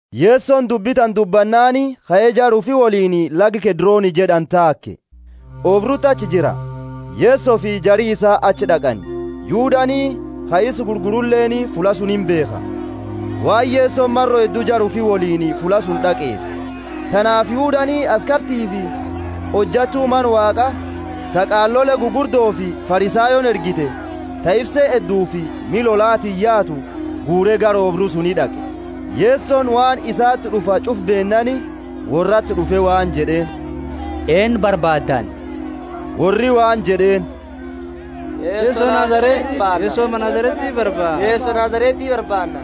Yesoni dubbi tana dubbannaani kae, jara ufi woliini laga Kedroni jed'ani taake. Oobruti achi jira, Yesofi jari isaa achi d'aqani. Yudani, ka isa gurguruleeni fulla suni imbeekha, waan Yesoni maro heddu jara ufi woliini fulla suni d'aqeefi. Tanaafi Yudani askartiifi hojattu Mana Waaqa ta qaalole gugurdofi Farisayooni ergite, ta ifse heddufi miha lolatiini yaatu, guure gara oobru suni d'aqe. Yesoni waan isati d'ufa ch'ufa beennaani, worrati d'ufe waan jed'eeni, Eennu barbaaddani? Worri waan jed'eeni, Yeso Nazareti barbaanna.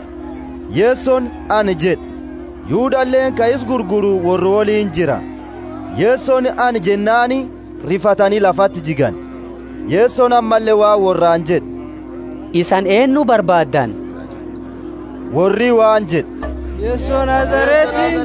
Yesoni, Ana jed'e. Yudaleeni ka isa gurguru worra woliini jira. Yesoni, Ana jennaani rifatani lafati jigani. Yesoni ammalle waan worraani jed'e, Isani eennu barbaaddani? Worri waan jed'e, Yeso Nazareti.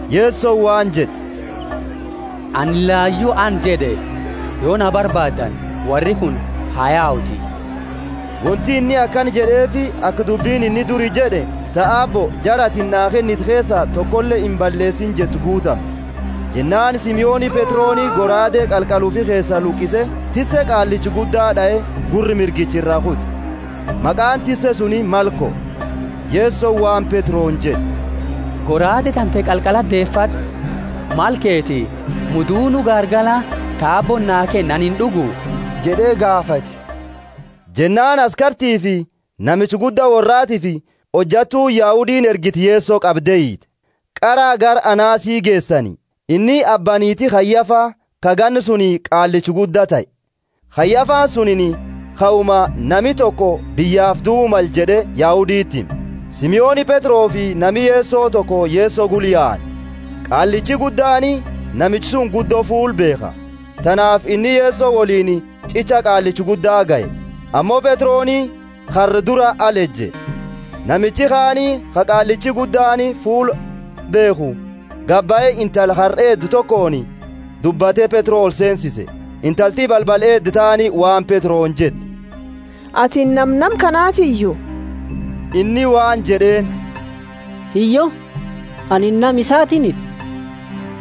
Yesoni waan jed'e, Anini layu, Ana jed'e. Yo na barbaaddani, worri kuni ha yauti. Wonti inni akana jed'eefi aka dubbini inni duri jed'e, ta Aabbo, jara atini naa kennite keesaa tokole imballeesine jettu guutamtu. Jennaani Simoni Petroni goraade qalqala ufi keesa luqise, tisse qaallicha gudda d'ae, gurra mirgicha iraa kute. Maqaani tisse suni Malko. Yesoni waan Petroni jed'e, Goraade tante qalqalati deefad'u, mala keti, muudunu gaargala ta Aabbooni naa kenne anini ind'ugu? jed'e gaafate. Jennaani askartiifi namicha gudda worraatiifi hojattuuni Yahudiini ergite Yeso qabde hiite. Qara gara Anasi geesani. Inni abba niiti Kayafa, ka ganna suni qaallicha gudda tahe. Kayafani sunini kauma, Nami toko biyyaafi duu male jed'e Yahuditi hime. Simoni Petrofi nami Yeso toko Yeso gula yaani. Qaallichi guddaani namicha suni guddo fuula beekha, tanaafi inni Yeso woliini ch'icha qaallicha gudda gahe. Ammo Petroni karra dura ala eje. Namichi kaani ka qaallichi guddaani fuula beekhu gabahe, intala karra eeddu tokooni dubbate Petro olseensise. Intalti balbala eeddu taani waan Petroni jette, Atini nama nama kanatiyu? Inni waan jed'eeni, Hiyyo, ani nama isatiiniti.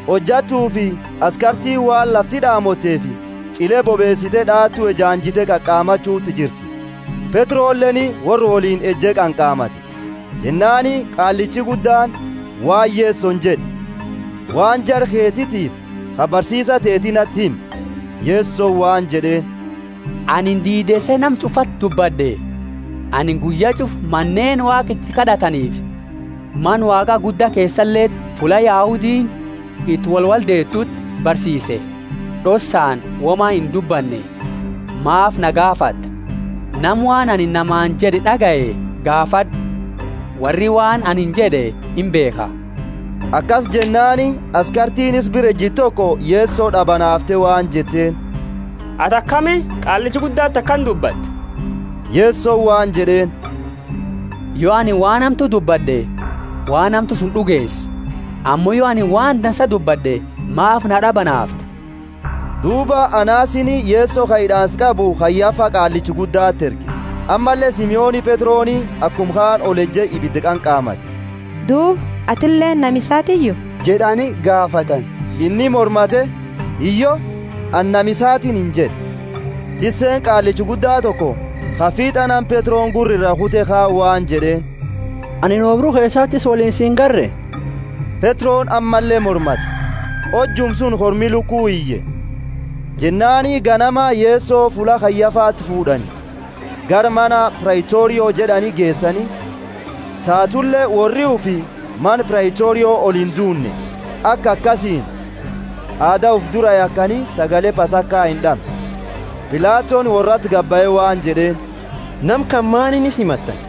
Hojattufi askartiini waan lafti d'aamoteefi ch'ile bobeesite d'aatu ejaanjite qanqamachuti jirti. Petroleeni worra woliini eje qanqamate. Jennaani qaallichi guddaani waan Yesoni jed'e, waan jara keetifi ka barsiisa teeti nati himi. Yesoni waan jed'eeni, Anini diideese nama ch'ufaati dubbad'e, anini guyya ch'ufa maneeni Waaqa iti kad'ataniifi Mana Waaqa gudda keesaleti fulla Yahudiini iti wolwoldeetuti barsiise, d'ossaani woma indubbanne. Maafi na gaafatta? Nama waan anini namaani jed'e d'agaye gaafad'u; worri waan ani jed'e imbeekha. Akasi jennaani askartiini isa bira ejitu toko Yeso d'abanaafte waan jetteeni, Ati akami qaallicha guddati akana dubbatta? Yesoni waan jed'eeni, Yo anini waan hamtu dubbad'e, waan hamtu suni d'ugeesi; ammo yo anini waan dansa dubbad'e maafi na d'abanaafta? Duuba Anasini Yeso ka hid'aansa qabu Kayafa qaallicha guddati erge. Ammalle Simoni Petroni akuma kaani oleje ibida qanqamate. Duuba, Atileeni nama isaatiiyu? jed'ani gaafatani. Inni mormate, Hiyyo, ani nama isatiiniti jed'e. Tisseeni qaallicha gudda toko, ka fiit'a nama Petroni gurra iraa kute kaani, waan jed'eeni, Ani oobru keesati isa woliini si ingarre? Petroni ammalle mormate, hojuma suni kormi lukuu iye. Jennaani ganama Yeso fulla Kayafati fuud'ani, gara mana Praitorio jed'ani geesani. Tatule worri ufi mana Praitorio oliinduunne, aka akasiini aada ufi dura yakani sagale Pasaka ind'amne. Pilatoni worrati gabahe waan jed'eeni, Nama kana maani isa himattani?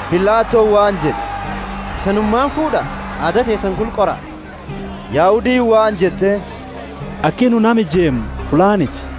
Pilatoni waan jed'e, Isanumaani fuud'a, aada teesani gula qora. Yahudiini waan jetteeni, Aki nu nama ijeemnu fullaaniti.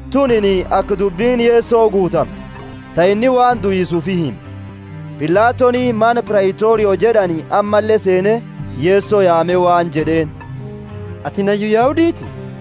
Tunini aka dubbini Yeso guutamtu, ta inni waan duisa ufi hime. Pilatoni mana Praitorio jed'ani ammalle seene Yeso yaame waan jed'eeni, Atini hayyu Yahuditi?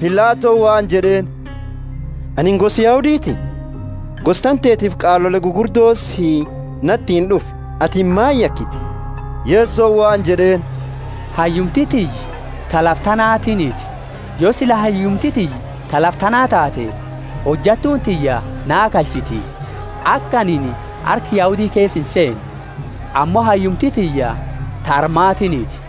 Pilatoni waan jed'eeni, Anini gosa Yahuditi? Gosa tantetiifi qaalole gugurdoti si natiini d'ufe, atini maani yakite? Yesoni waan jed'eeni, Hayyumti tiyya ta lafa tanaatiiniti; yo sila hayyumti tiyya ta lafa tanaa taate, hojattuuni tiyya naa kalchiti, aka anini harka Yahudi keesa inseene. Ammo hayyumti tiyya ta armatiiniti.